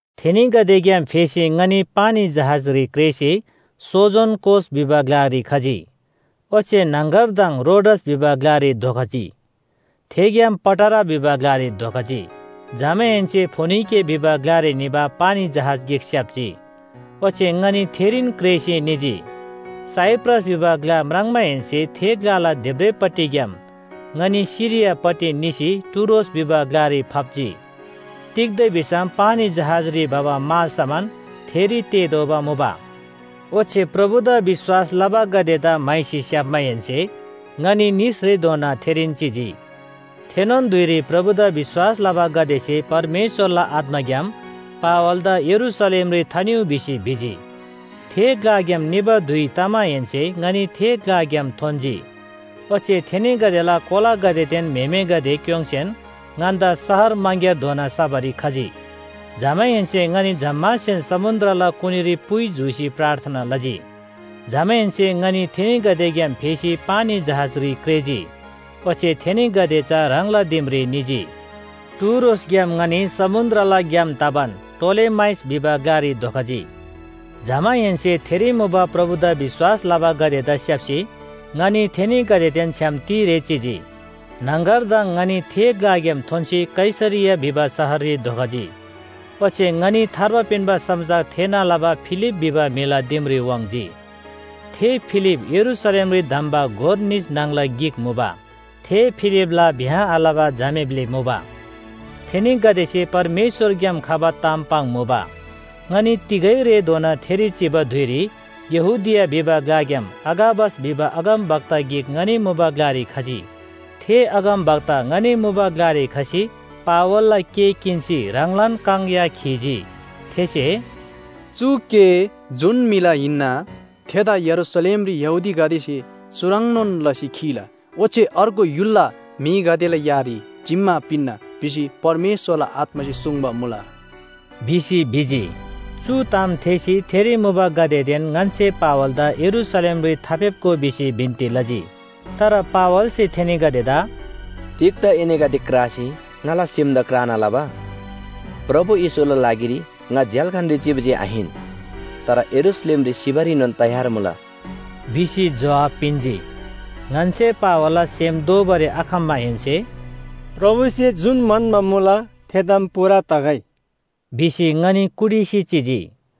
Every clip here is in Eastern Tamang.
थेनीगदेग्‍याम फेसी ङनी पानी जहाजरी क्रेःसी सोजोन कोस भिबा ग्‍लारी खजी, ओच्‍छे न्‍हङगरदङ रोडस भिबा ग्‍लारी धोखजी थेग्‍याम पटारा भिबा ग्‍लारी धोखजी। जमाहेन्‍से फोनिके भिबा ग्‍लारी निबा पानी जहाज गिक स्‍याप्‍जी ओच्‍छे ङनी थेरीन क्रेःसी निजी। साइप्रस भिबा ग्‍ला म्राङ्माहेन्‍से थे ग्‍लाला देब्रेपट्टिग्‍याम ङनी सिरियापट्टि निसी टुरोस भिबा ग्‍लारी फाप्‍जी। तिग्‍दा भिसम पानी जहाजरी भबा मालसामान थेरी तेःतोःबा मुबा। ओच्‍छे प्रभुदा विश्‍वास लबागदेदा म्‍हाइसी स्‍याप्‍माहेन्‍से ङनी निसरेधोना थेरीन चिजी। थेनोन धुइरी प्रभुदा विश्‍वास लबागदेसे परमेश्‍वरला आत्‍माग्‍याम पावलदा यरूशलेमरी थानिउ भिसी भिजी। थे ग्‍लाग्‍याम निबा धुइ तमाहेन्‍से ङनी थे ग्‍लाग्‍याम थोन्‍जी। ओच्‍छे थेनीगदेला कोलागदेदेन म्‍हेमेगदे क्‍योङ्‌सेन ङन्‍दा शहर मङग्‍यारधोना सबारी खजी। जमाहेन्‍से ङनी जम्‍मासेन समुन्‍द्रला कुनीरी पुइ जूसी प्रार्थना लजी। जमाहेन्‍से ङनी थेनीगदेग्‍याम फेसी पानी जहाजरी क्रेःजी, ओच्‍छे थेनीगदे चा ह्राङला दिमरी निजी। टुरोसग्‍याम ङनी समुन्‍द्रला ग्‍याम तबान टोलेमाइस भिबा ग्‍लारी धोखजी। जमाहेन्‍से थेरी मुबा प्रभुदा विश्‍वास लबागदेदा स्‍याप्‍सी ङनी थेनीगदेदेन छ्‌याम तिरे चिजी। न्‍हङगरदङ ङनी थे ग्‍लाग्‍याम थोन्‍सी कैसरिया भिबा शहररी धोखजी, ओच्‍छे ङनी थार्बा पिन्‍बा समाचार थेःना लबा फिलिप भिबा म्‍हिला दिमरी वाङ्‌जी। थे फिलिप यरूशलेमरी धम्‍बा गोर निस न्‍हङला गिक मुबा। थे फिलिपला ब्‍याह आलबा झामे ब्‍लि मुबा। थेनीगदेसे परमेश्‍वरग्‍याम खबा ताम पाङ्मुबा। ङनी तिगै रेधोना थेरी चिबा धुइरी यहूदिया भिबा ग्‍लाग्‍याम अगाबस भिबा अगमवक्ता गिक ङनी मुबा ग्‍लारी खजी। थे अगमवक्ता ङनी मुबा ग्‍लारी खसी पावलला केः किन्‍सी ह्राङलान काङ या खीजी। थेसे “चु केः जुन म्‍हिला हिन्‍ना थेदा यरूशलेमरी यहूदीगदेसे चुह्रङ्‌नोन लसी खीला। ओच्‍छे अर्गु य्‍हुलला म्‍हिगदेला यारी जिम्‍मा पिन्‍ना भिसी परमेश्‍वरला आत्‍मासे सुङ्बा मुला” भिसी भिजी। चु ताम थेःसी थेरी मुबागदेदेन ङन्‍से पावलदा यरूशलेमरी थाफेप्‍गो भिसी बिन्‍ती लजी। तर पावलसे थेनीगदेदा “तिग्‍दा एनीगदे क्रासी ङाला सेम क्राना लबा? प्रभु येशूला लागिरी ङा झ्‍याल्‍खानरी चिबा जे आहिन, तर यरूशलेमरी सिबारीनोन तयार मुला” भिसी जोहाब पिन्‍जी। ङन्‍से पावलला सेम दोःबारी आखम्‍माहेन्‍से “प्रभुसे जुन म्‍हन्‍बा मुला थे ताम पूरा तगै” भिसी ङनी कुटिसी चिजी।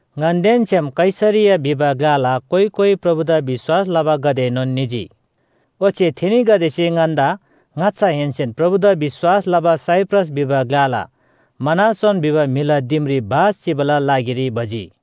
ङन्‍देन छ्‌याम कैसरिया भिबा ग्‍लाला कोइ कोइ प्रभुदा विश्‍वास लबागदेएनोन निजी। ओच्‍छे थेनीगदेसे ङन्‍दा ङाच्‍छाहेन्‍सेन प्रभुदा विश्‍वास लबा साइप्रस भिबा ग्‍लाला मनासोन भिबा म्‍हिला दिमरी बास चिबाला लागिरी भजी।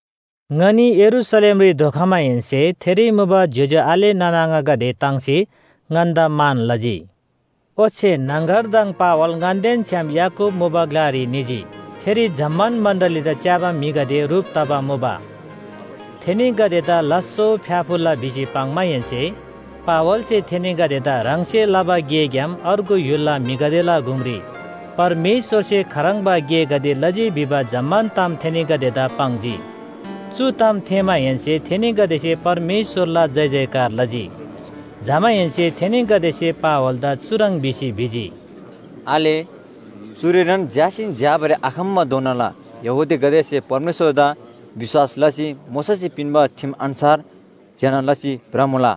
ङनी यरूशलेमरी धोखमाहेन्‍से थेरी मुबा ज्‍योज्‍यो आले नाना आङागदे ताङ्सी ङन्‍दा मान लजी। ओच्‍छे न्‍हङगरदङ पावल ङन्‍देन छ्‌याम याकूब मुबा ग्‍लारी निजी। थेरी जम्‍मान मण्‍डलीदा च्‍याबा म्‍हिगदे ह्रुप तबा मुबा। थेनीगदेदा लास्‍सो फ्‍याफुल्‍ला भिसी पाङ्माहेन्‍से पावलसे थेनीगदेदा ह्राङसे लबा गेग्‍याम अर्गु य्‍हुलला म्‍हिगदेला गुङरी परमेश्‍वरसे खाह्रङ्बा गेगदे लजी भिबा जम्‍मान ताम थेनीगदेदा पाङ्जी। चु ताम थेःमाहेन्‍से थेनीगदेसे परमेश्‍वरला जयजयकार लजी। जमाहेन्‍से थेनीगदेसे पावलदा चुह्रङ् भिसी भिजी, “आले, चुरीनोन झ्‍यासीन झ्‍याबारी आखम्‍बाधोनाला यहूदीगदेसे परमेश्‍वरदा विश्‍वास लसी मोशासे पिन्‍बा ठिम अन्‍छार ज्‍यना लसी भ्रमुला।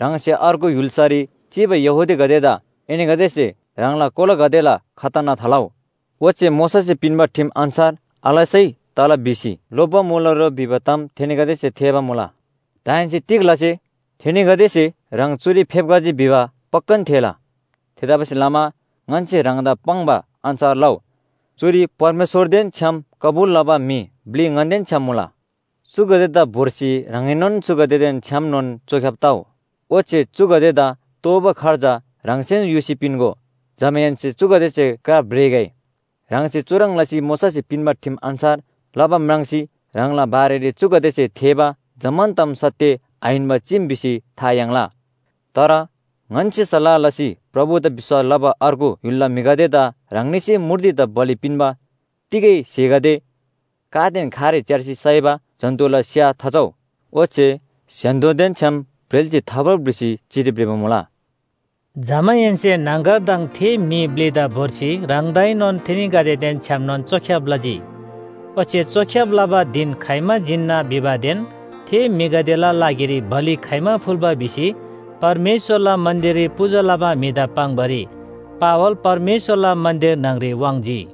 ह्राङसे अर्गु य्‍हुल्‍सारी चिबा यहूदीगदेदा एनीगदेसे ह्राङला कोलागदेला खतना थालउ। ओच्‍छे मोशासे पिन्‍बा ठिम अन्‍छार आलसै तला भिसी लोप्‍बा मुला रो भिबा ताम थेनीगदेसे थेःबा मुला। दाहेन्‍से तिग लसे? थेनीगदेसे ह्राङ चुरी फेप्‍खजी भिबा पक्‍कान थेःला। थेतबासेलमा ङन्‍से ह्राङदा पाङ्बा अन्‍छार लउ, चुरी परमेश्‍वरदेन छ्‌याम कबुल लबा म्‍हि ब्‍लि ङन्‍देन छ्‌याम मुला। चुगदेदा भोर्सी ह्राङएनोन चुगदेदेन छ्‌यामनोन चोख्‍याब तउ, ओच्‍छे चुगदेदा तोःबा खर्च ह्राङसेन युसी पिन्‍गो। जमाहेन्‍से चुगदेसे क्रा भ्रेगै। ह्राङसे चुह्रङ् लसी मोशासे पिन्‍बा ठिम अन्‍छार लबा म्राङ्सी ह्राङला बारेरी चुगदेसे थेःबा जम्‍मान ताम सत्‍य आहिन्‍बा चीम भिसी था याङ्ला। तर ङन्‍से सल्‍लाह लसी प्रभुदा विश्‍वास लबा अर्गु य्‍हुलला म्‍हिगदेदा ह्राङनीसे मूर्तिदा बलि पिन्‍बा तिगै स्‍हेगदे, कादेन खारे च्‍यार्सी साइबा जन्‍तुला स्‍या थाचउ, ओच्‍छे स्‍य्‍हान्‍दोदेन छ्‌याम ब्रेल्‍सी थाभ्रउ भिसी चिठी भ्रिबा मुला।” जमाहेन्‍से न्‍हङगरदङ थे म्‍हि ब्‍लिदा भोर्सी ह्राङदाएनोन थेनीगदेदेन छ्‌यामनोन चोख्‍याब लजी, ओच्‍छे चोख्‍याब लबा धिन खाइमा जिन्‍ना भिबादेन थे म्‍हिगदेला लागिरी बलि खाइमा फुल्‍बा भिसी परमेश्‍वरला मन्‍दिररी पूजा लबा म्‍हिदा पाङ्‌बारी पावल परमेश्‍वरला मन्‍दिर न्‍हङरी वाङ्‌जी।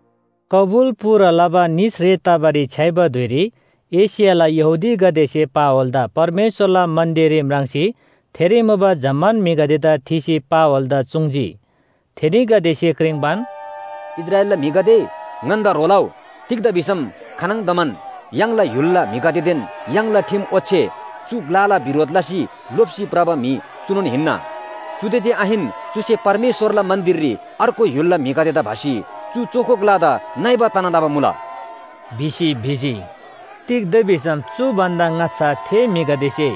कबुल पूरा लबा निसरे तबारी छ्‌याइबा धुइरी एशियाला यहूदीगदेसे पावलदा परमेश्‍वरला मन्‍दिररी म्राङ्सी थेरी मुबा जम्‍मान म्‍हिगदेदा थीसी पावलदा चुङ्‌जी। थेनीगदेसे क्रिङ्‌बान, “इस्राएलला म्‍हिगदे ङन्‍दा ह्रो लउ। तिग्‍दा भिसम खानङदमान य्‍हाङला य्‍हुलला म्‍हिगदेदेन य्‍हाङला ठिम ओच्‍छे चु ग्‍लाला बिरोध लसी लोप्‍सी भ्रबा म्‍हि चुनोन हिन्‍ना। चुदे जे आहिन, चुसे परमेश्‍वरला मन्‍दिररी अर्गु य्‍हुलला म्‍हिगदेदा भसी चु चोखो ग्‍लादा नइबा तना लबा मुला” भिसी भिजी। तिग्‍दा भिसम चु भन्‍दा ङाच्‍छा थे म्‍हिगदेसे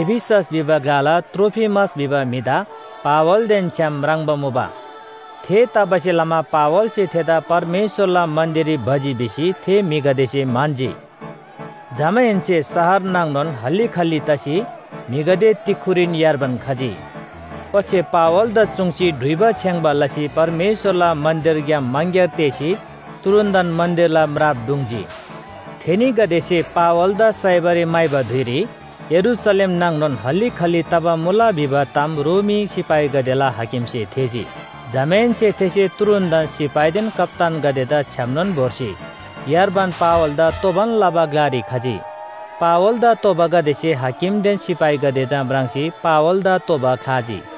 एफिसस भिबा ग्‍लाला त्रोफिमस भिबा म्‍हिदा पावलदेन छ्‌याम म्राङ्बा मुबा। थेतबासेलमा पावलसे थेदा परमेश्‍वरला मन्‍दिररी भजी भिसी थे म्‍हिगदेसे म्‍हन्‍जी। जमाहेन्‍से शहर नाङनोन हल्‍ली खल्‍ली तसी म्‍हिगदे तिक्‍खुरीन यार्बान खजी। ओच्‍छे पावलदा चुङ्सी डुइबा छेङ्‌बा लसी परमेश्‍वरला मन्‍दिरग्‍याम मङग्‍यार तेःसी तुरुन्‍तन मन्‍दिरला म्राप ढुङ्‌जी। थेनीगदेसे पावलदा साइबारी म्‍हाइबा धुइरी यरूशलेम नाङनोन हल्‍ली खल्‍ली तबा मुला भिबा ताम रोमी सिपाहीगदेला हाकिमसे थेःजी। जमाहेन्‍से थेसे तुरुन्‍तन सिपाहीदेन कप्‍तानगदेदा छ्‌यामनोन भोर्सी यार्बान पावलदा तोबान लबा ग्‍लारी खजी। पावलदा तोबागदेसे हाकिमदेन सिपाहीगदेदा म्राङ्सी पावलदा तोबा ख्‍लाजी।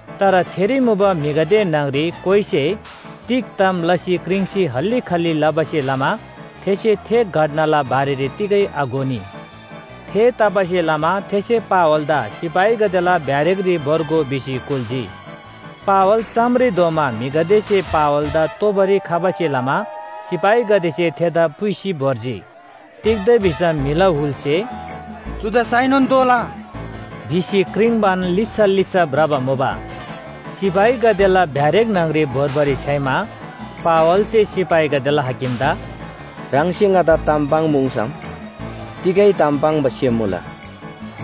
तर थेरी मुबा म्‍हिगदे न्‍हङरी कोइसे तिग ताम लसी क्रिङ्सी हल्‍ली खल्‍ली लबासे लमा थेसे थे घटनाला बारेरी तिगै आघोनी। थेतबासेलमा थेसे पावलदा सिपाहीगदेला ब्‍यारेकरी भोर्गो भिसी कुल्‍जी। पावल चामरी धोमा म्‍हिगदेसे पावलदा तोबारी खबासे लमा सिपाहीगदेसे थेदा पुइसी भोर्जी। तिग्‍दा भिसम म्‍हिला हुलसे “चुदा साइनोन तोःला” भिसी क्रिङ्‌बान लिच्‍छा लिच्‍छा भ्रबा मुबा। सिपाहीगदेला ब्‍यारेक न्‍हङरी भोर्बारी छ्‌याइमा पावलसे सिपाहीगदेला हाकिमदा “ह्राङसे ङादा ताम पाङ्‌पुङ्‌सम तिगै ताम पाङ्बा सेम मुला”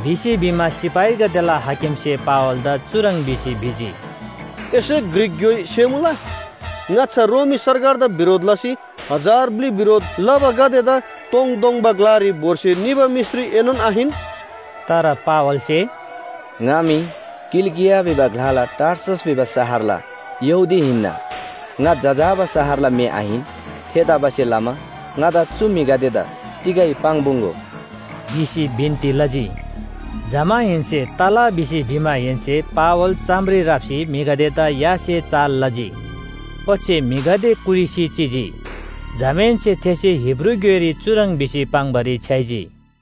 भिसी भिमा सिपाहीगदेला हाकिमसे पावलदा चुह्रङ् भिसी भिजी, “एसे ग्रीक ग्‍योइ सेमुला? ङाच्‍छा रोमी सरकारदा बिरोध लसी हजार ब्‍लि बिरोध लबागदेदा तोङतोङबा ग्‍लारी भोर्सी निबा मिश्री एनोन आहिन?” तर पावलसे “ङा मी किलिकिया भिबा ग्‍लाला टार्सस भिबा शहरला यहूदी हिन्‍ना, ङा जजाबा शहरला म्‍हि आहिन। थेतबासेलमा ङादा चु म्‍हिगदेदा तिगै पाङ्‌पुङ्‌गो” भिसी बिन्‍ती लजी। जमाहेन्‍से “तला” भिसी भिमाहेन्‍से पावल चामरी राप्‍सी म्‍हिगदेदा यासे चाल लजी, ओच्‍छे म्‍हिगदे कुटिसी चिजी। जमाहेन्‍से थेसे हिब्रू ग्‍योइरी चुह्रङ् भिसी पाङ्‌बारी छ्‌याइजी।